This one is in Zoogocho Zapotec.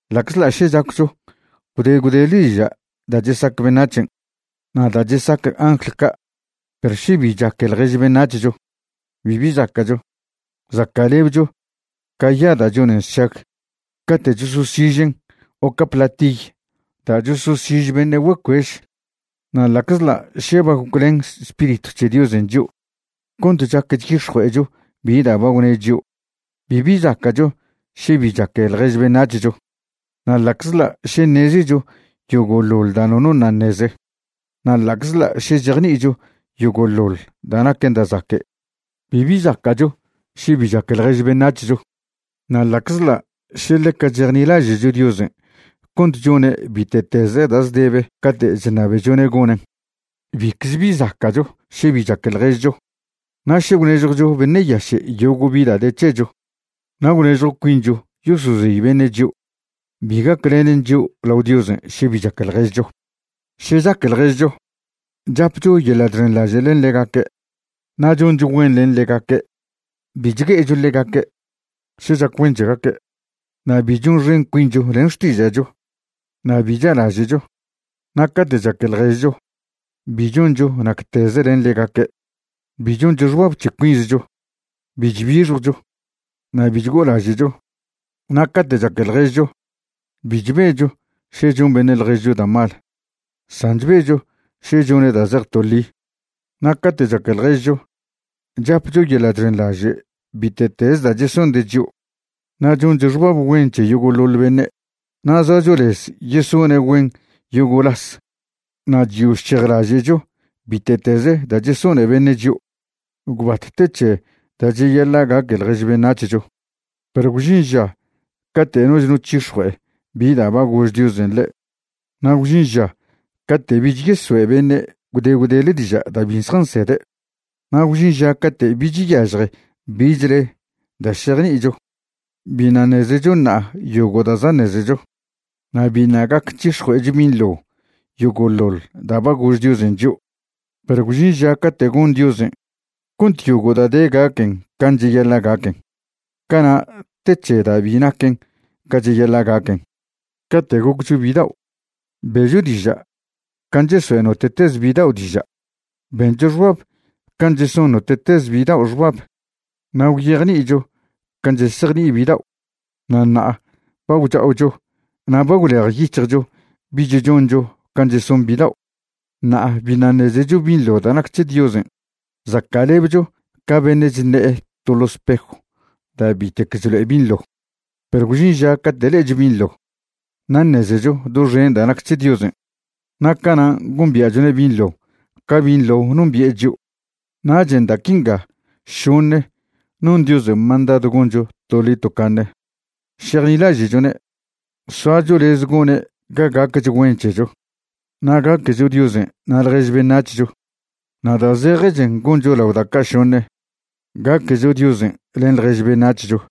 Ḻa'czḻa' še chaccho gwde gwdele diža' da' chesac beṉac̱hen' na' da' chesac angl ca', perw še bi chaque ḻjež beṉac̱hcho, bibi zaca'cho. Zaca'lebcho ca ya da' chonen sšag cate' chososižen' o ca platiy da' chososiž beṉe' güecuež. Na' ḻa'czḻa' še ba goclen Spiritw c̱he Diosen' chio' cont chac chyix̱jue'echo bi da' ba gwne' chio', bibi zaca'cho še bi chaque ḻjež beṉac̱hcho. Na' ḻa'czḻa' še ṉezecho yogo'ḻoḻ da' nono ṉa' ṉeze, na' ḻa'czḻa' še chejni'icho yogo'ḻoḻ da' naquen da' zaque', bibi zaca'cho še bi chaque ḻjež beṉac̱hcho. Na' ḻa'czḻa' še ḻeca chejnilaže'cho Diosen' cont chone' bite'teze da' zdebe cate' chṉabechone' gonen', bicze bi zaca'cho še bi chaque ḻježcho. Na' še gwnežjwcho beṉe' yaše' yogo' bi da' de c̱hecho na' gwnežjw cuincho yosozey beṉe' chio', bi gaclenen chio' lao Diosen' še bi chaque ḻježcho. Še chaque ḻježcho, chapcho yeḻa' chxenḻaže' len ḻegaque', na' choncho güen len ḻegaque', bi chgue'echo ḻegaque' še chac güen c̱hegaque', na' bi chonxen cuincho len xtiža'cho, na' bi cha'laže'cho. Na' cate' chaque ḻježcho bi choncho nacteze len ḻegaque', bi choncho xbab c̱he cuinzcho, bi chbixjwcho, na' bi chgo'olaže'cho. Na' cate' chaque ḻježcho bi chbecho še chon beṉe' ḻježcho da' mal, san chbecho še chone' da' zej to ḻi. Na' cate' chaque ḻježcho, chapcho yeḻa' chxenḻaže' bite'teze da' chesonde' chio', na' choncho xbab güen c̱he yogo'ḻoḻ beṉe', na' zoacho lez yesone' güen yogo' las, na' chyo chchejlaže'cho bite'teze da' chesone beṉe' chio'. Gwbat te c̱he da' cheyaḻa' gaque ḻjež beṉac̱hcho. Perw gwžin ža cate' noch no c̱hix̱jue'e bi da' ba gož Diosen' ḻe', na' gwžin ža cate' bich yesoe' beṉe' gwde gwdele diža' da' bi zjansede', na' gwžin ža cate' bich yažje bichle da' šejni'icho. Biṉa' ṉezecho ṉa'a yogo' da' za' ṉezecho, na' biṉa' gac c̱hix̱jue'echo binḻo yogo'ḻoḻ da' ba gož Diosen' chio'. Perw gwžin ža cate' gon Diosen' cont yogo' da' de gaquen can' cheyaḻa' gaquen. Cana' te c̱he da' bi naquen ca cheyaḻa' gaquen. Cate' goccho bidao' be'cho diža' can' chesoe' note'teze bidao' diža', bencho xbab can' cheson note'teze bidao' xbab, na' gwyejni'icho can' chesejni'i bidao'. Na' ṉa'a ba gwcha'ocho na' ba gwlejyic̱hjcho bich choncho can' cheson bidao'. Ṉa'a biṉa' ṉezecho binḻo da' nac c̱he Diosen'. Zaca'lebcho ca beṉe' chṉe'e to ḻo spejw da' bitec chlo'e binḻo. Perw gwžin ža cate' le'echo binḻo na' ṉezecho doxen da' nac c̱he Diosen', na' canan' gombia'chone' binḻo ca binḻo nombi'e chio'. Nachen' da' quinga šoṉe non Diosen' mandadw goncho toḻi tocaṉe: šejnilaže'chone', soacho lez gone' ga gacch güen c̱hecho, na' gaquecho Diosen' na' ḻjež beṉac̱hcho. Na' da' zejechen goncho lao da' ca' šoṉe, gaquecho Diosen' len ḻjež beṉac̱hcho.